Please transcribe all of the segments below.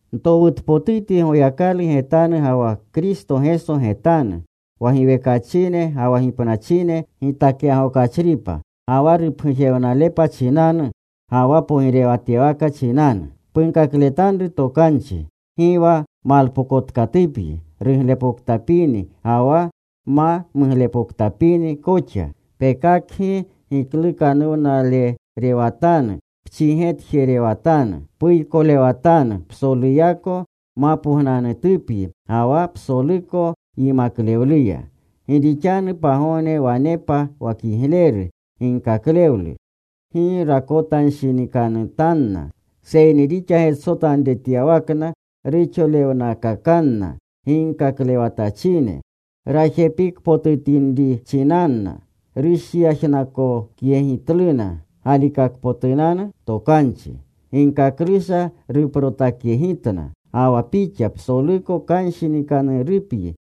Ntowutpotutyi Goyakalu getanu, ga wa Kristo Geso getanu, wa giwekachine ga wa gipnachine gitakyagokachripa, ga wa rupgujewnalepa chinanu, ga wa pogirewatyawaka chinanu, punkakletanru tokanchi. Gi wa malpokotkatupyi ruglepoktapini ga wa ma muglepoktapini koxa. Pekakgi giklukanuwnalerewatanu, pchigetjerewatanu, puykolewatanu psoluyako mapognanutupyi ga wa psoluko yimaklewluya. Gi rixanu pagogne wanepa wa kigleru ginkaklewlu gi rakotanshinikanutanna. Seyni rixa getsotanretyawakna, ruxolewnakakanna ginkaklewatachine rajepikpotinrinchinanna. Rushyajnakyegitluna galikakpotunanu tokanchi. Ginkaklusha ruprotakyegitna. Ga wa pixa psoluko kanshinikanuruyapyi.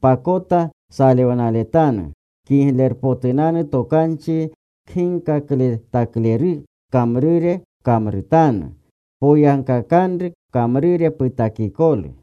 Pakota salewnaletanu. Kiglerpotunanu Tokanchi kginkakletakleru kamrure pkamrutanu. Poyagkakanru pkamrure putakikolu.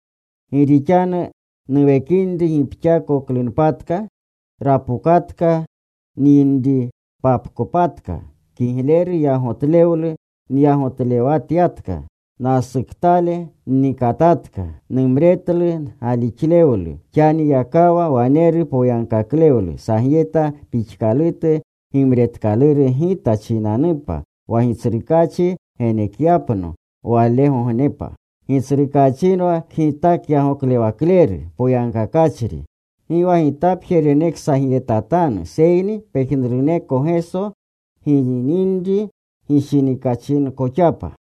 Gi rixanu nuwekinri gipkaakoklunpatka. Rapokatka nyinripapkopatka. Kigleru yagotlewlu nyagotlewatyatka. Nasuktale nnikatatka. Numretlu galixlewlu. Xaniyakawa waneru poyagkaklewlu sagyeta pixkalutu gimretkaluru gita chinanupa, wa Gitsrukaachi genekyapno walegognepa. Gitsrukaachinwa kgitakyagoklewakleru poyagkakachri. Gi wa gitapje reneksagyetatanu, seyni pejnuruneko Geso gininri gishinikachinkoxapa.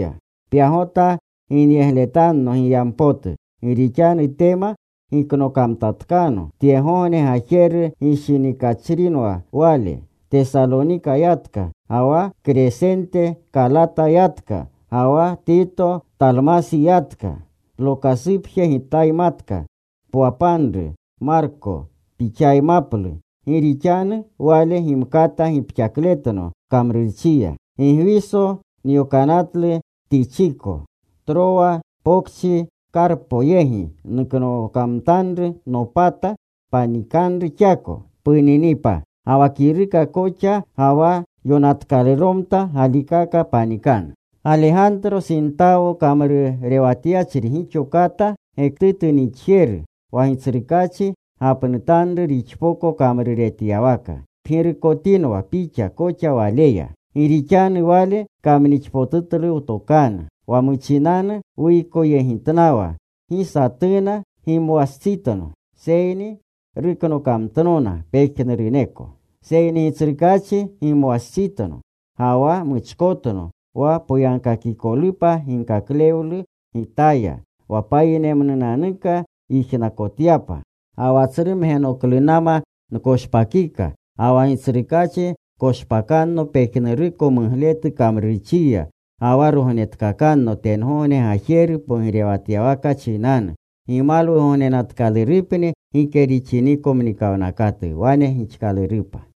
Pyagota ginyegletanno giyampotu. Gi rixanu Tema giknokamtatkano. Tyegogne gajeru gishinikachrinwa wale. Tesalonika yatka. Ga wa Kresente Kalata yatka. Ga wa Tito Talmasi yatka. Lokasupje gitaymatka. Pwapanru Marko. Pixaymaplu. Gi rixanu wale gimkata gipxakletno kamrurchiya. Gigwiso nyokanatlu Tichiko. Trowa pokchi Karpo yegi nuknokamtanru nopata. Panikanru xako puninipa. Ga wa kiruka koxa, ga wa yonatkaluromta galikaka panikanu. Galegantro sintawo kamrurewatyachri gixo kata gektutu nixjeru. Wa Gitsrukaachi gapnutanru rixpoko kamruretyawaka. Pgirukotinwa pixa koxa waleya. Gi rixanu wale kamnixpotutlu wtokanu. Wa muchinanu nuykoyegitnawa gi satuna gimwastsitno. Seyni ruknokamtnona pejnuruneko. Seyni Gitsrukaachi gimwastsitno, ga wa muchkotno wa poyagkakikolupa ginkaklewlu gitaya, wa payinemnunanuka yijnakotyapa. Ga wa tsru mgenoklunama nkoshpakika. Ga wa Gitsrukaachi koshpakanno pejnuruko mugletu kamrurchiya. Ga wa rognetkakanno tengogne gajeru pogirewatyawaka chinanu. Gimalwugognenatkalurupni gike rixiniko mnikawnakatu. Wane gixkalurupa.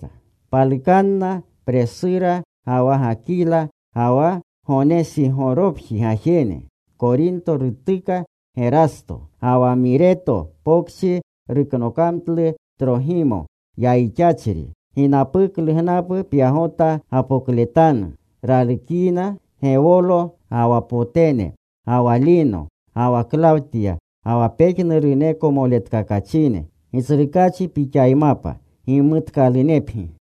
Palukanna Presura ga wa Gakila, ga wa Gonesigoropji gajene. Korinto rutuka Gerasto. Ga wa Mireto Pokchi nuknokamtlu Trogimo yayixachri. Ginapuklu gnapu pyagota gapokletanu. Ralukyina Gewolo, ga wa Potene, ga wa Lino, ga wa Klawtya, ga wa pejnuruneko moletkakachine. Gitsrukaachi pixaymapa. Gimutkalunepgi.